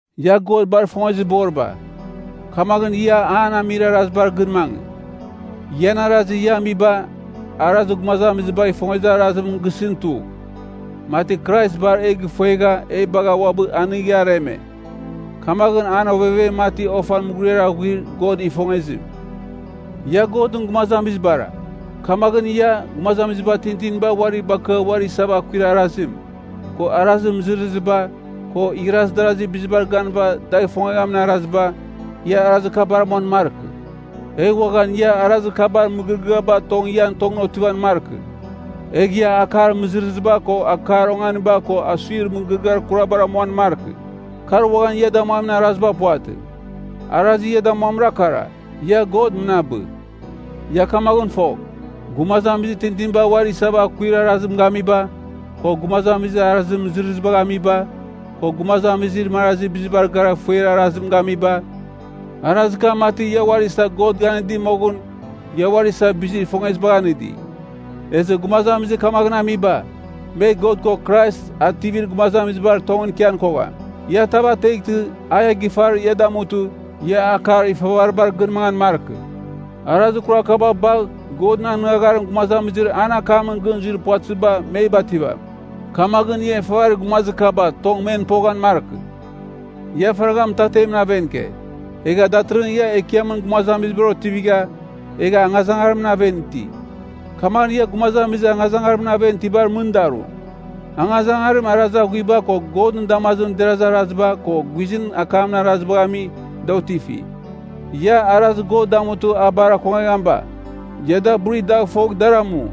Ia God bar ifongezir boriba, kamaghɨn ia an amir arazibar gɨn mangɨ. Ian arazir ia amiba, arazir gumazamizibagh ifongezir arazim gisɨn tugh, mati Krais bar e gifuegha e bagha uabɨ anigha areme. Kamaghɨn an ovevem mati ofan mughuriar aghuir God ifongezim. Ia Godɨn gumazamizibara. Kamaghɨn ia, gumazamiziba tintiniba uari bakɨa uari isava akuir arazim, ko arazir mɨzɨrɨziba, ko igharaz darazir bizibar ganɨva dagh ifongamin araziba, ia arazir kabar amuan markɨ. Egh uaghan ia arazir kabar mɨgɨrɨgɨaba tong ian tongɨn otivan markɨ. Egh ia akar mɨzɨrɨziba ko akar onganiba ko asuir mɨgɨrɨgɨar kurabar amuan markɨ. Kar uaghan ia damuamin araziba puvatɨ. Arazir ia damuamimra kara, ia God mɨnabɨ. Ia kamaghɨn fogh, gumazamizir tintiniba uari isava akuir arazim gamiba, ko gumazamizir arazir mɨzɨrɨzibagh amiba, ko gumazamizir marazir bizibar gara ifuer arazim gamiba, (Arazir kam mati ia uari isa God ganɨdi moghɨn ia uari isa bizir ifongezibagh anɨdi), ezɨ gumazamizir kamaghɨn amiba, me God ko Krais Ativir Gumazamizibar tongɨn ikian kogham. Ia tav ateghtɨ a ia gifar ia damutɨ, ia akar ifavaribar gɨn mangan markɨ. Arazir kurar kaba bagh Godɨn anɨngagharim gumazamizir an akamɨn gɨn zuir puvatɨziba me bativam. Kamaghɨn, ia ifavarir gumazir kaba tong men poghan markɨ. Ia faragha mɨtatemɨn aven ike, egha datɨrɨghɨn ia Ekiamɨn gumazamizibar otivigha, egha angazangarimɨn aven iti. Kamaghɨn ia gumazamizir angazangarimɨn aven itibar mɨn daru. (Angazangarim arazir aghuiba ko Godɨn damazimɨn derazir araziba ko guizɨn akamɨn arazibagh ami, da otifi.) Ia, arazir God damutɨ a bar akongeghamiba, ia da buri dagh fogh dar amu.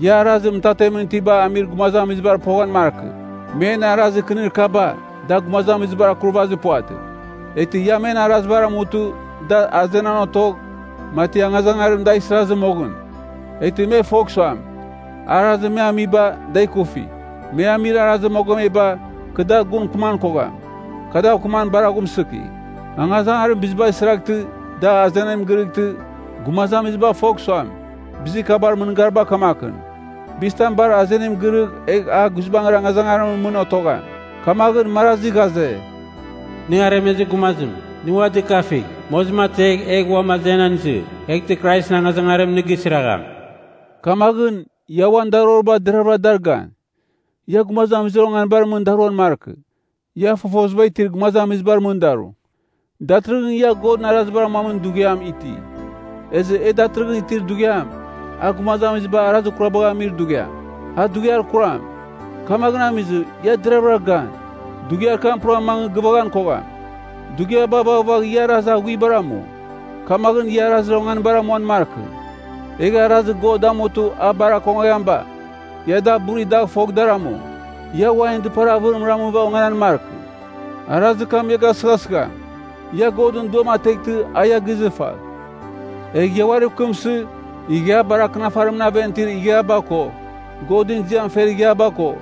Ia arazir mɨtatemɨn itibagh amir gumazamizibar poghan markɨ. Men arazir kɨnir kaba, da gumazamizibar akurvazir puvatɨ. Eghtɨ ia men arazibar amutɨ, da azenan otogh, mati angazangarim dagh isirazɨ moghɨn, eghtɨ me fogh suam, arazir me amiba, da ikufi. Me amir arazir mogomeba, kɨ dar gun mɨkɨman kogham. Kɨ dav mɨkɨman bar aghumsɨki. Angazangarim bizibagh isiraghtɨ, da azenim girɨghtɨ, gumazamiziba fogh suam, bizir kabar mɨngariba kamakɨn. Bizitam bar azenim girɨgh egh a guizbangɨra angazangarimɨn mɨn otogham. Kamaghɨn, marazi ghaze, “Nɨ aremezir gumazim, nɨ ua dɨkafigh, mozim ategh egh uam azenan izɨ. Eghtɨ Kraisɨn angazangarim nɨ gisiragham.” Kamaghɨn, ia uan daroriba deravɨra dar gan. Ia gumazamizir onganibar mɨn daruan markɨ. Ia fofoziba itir gumazamizibar mɨn daru. Datɨrɨghɨn ia Godɨn arazibar amuamin dughiam iti. Ezɨ e datɨrɨghɨn itir dughiam, a gumazamiziba arazir kurabagh amir dughiam, a dughiar kuram. Kamaghɨn amizɨ, ia deravɨra gan, dughiar kam pura mangɨ gɨvaghan kogham. Dughiaba vaghvagh ia arazir aghuibar amu. Kamaghɨn ia arazir onganibar amuan markɨ. Egh arazir God damutɨ a bar akongeghamiba, ia da buri dagh fogh dar amu. Ia wainɨn dɨpar avɨrim ramɨva onganan markɨ, arazir kam ia gasɨghasɨgham. Ia Godɨn Duam ateghtɨ a ia gizɨfagh. Egh ia uariv kɨmsɨ, Ighiabar Akɨnafarimɨn aven itir ighiaba ko, Godɨn ziam fer ighiaba ko,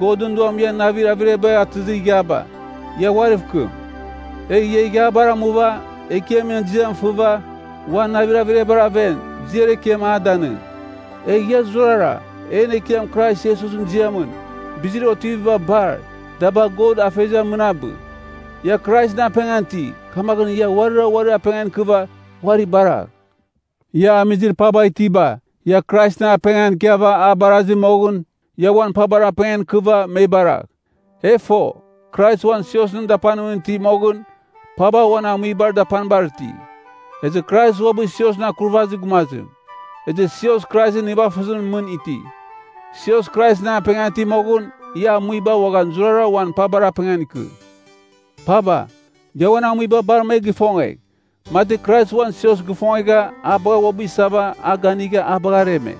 Godɨn Duam ian navir averiabagh atɨzir ighiaba, ia uariv kɨm. Egh ia ighiabar amuva, Ekiamɨn ziam fɨva, uan navir averiabar aven, ziar ekiam a danɨng. Egh ia zurara, en Ekiam Krais Iesusɨn ziamɨn, bizir otiviba bar, da bagh God Afeziam mɨnabɨ. Ia Kraisɨn apengan iti, kamaghɨn ia uarira uarir apengan ikɨva uari baragh. Ia amizir paba itiba, ia Kraisɨn apengan ikiava a barazi moghɨn, ia uan pabar apengan ikɨva me baragh. E fo, Krais uan siosɨn dapanimɨn iti moghɨn, paba uan amuibar dapanibar iti. Ezɨ Krais uabɨ siosɨn Akurvazir Gumazim, ezɨ sios Kraisɨn nivafɨzimɨn mɨn iti. Sios Kraisɨn apengan iti moghɨn, ia amuiba uaghan zurara uan pabar apengan ikɨ. Paba, ia uan amuiba bar me gifongegh, mati Krais uan sios gifongegha a bagha uabɨ isava a ganigha a bagha areme.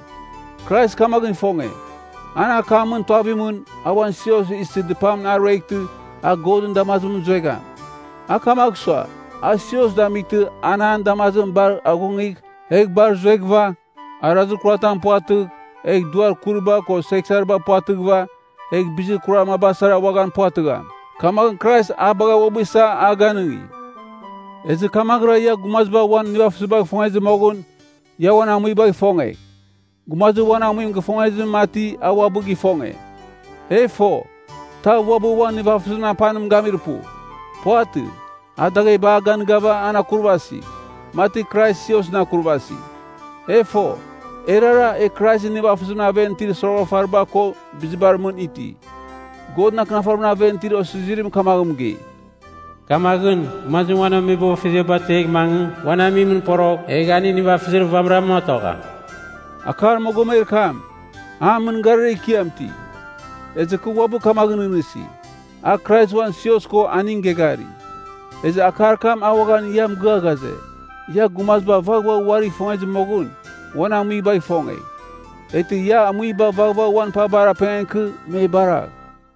Krais kamaghɨn ifonge, an akamɨn tuavimɨn, a uan sios isɨ dɨpamɨn a rueghtɨ a Godɨn damazimɨn zuegham. A kamagh sua, a sios damightɨ an an damazimɨn bar aghungigh, egh bar zueghɨva, arazir kuratam puvatɨgh, egh duar kuriba ko seghsariba puvatɨghɨva, egh bizir kurar maba sara uaghan puvatɨgham. Kamaghɨn Krais a bagha uabɨ isa a ganɨngi. Ezɨ kamaghɨra ia gumaziba uan nivafɨzibagh ifongezɨ moghɨn, ia uan amuibagh ifongegh. Gumazir uan amuim gifongezim mati a uabɨ gifonge. E fo, tav uabɨ uan nivafɨzimɨn apanim gamir pu. Puvatɨ, a dagheba a ganɨgava an akurvasi, mati Krais siosɨn akurvasi. E fo, erara, e Kraisɨn nivafɨzimɨn aven itir soroghafariba ko bizibar mɨn iti. Godɨn Akɨnafarimɨn aven itir osizirim kamaghɨn mɨgei, “Kamaghɨn, gumazim uan ameboghfeziaba ategh mangɨ, uan amuimɨn porogh egh aning nivafɨzir vamɨram otogham.” Akar mogomer kam, a mɨngarir ekiam iti. Ezɨ kɨ uabɨ kamaghɨn nɨghnɨsi, a Krais uan sios ko aning geghari. Ezɨ akar kam a uaghan ia mɨgɨa ghaze, ia gumaziba vaghvagh uarigh ifongezɨ moghɨn uan amuibagh ifongegh. Eghtɨ ia amuiba vaghvagh uan pabar apengan ikɨ me baragh.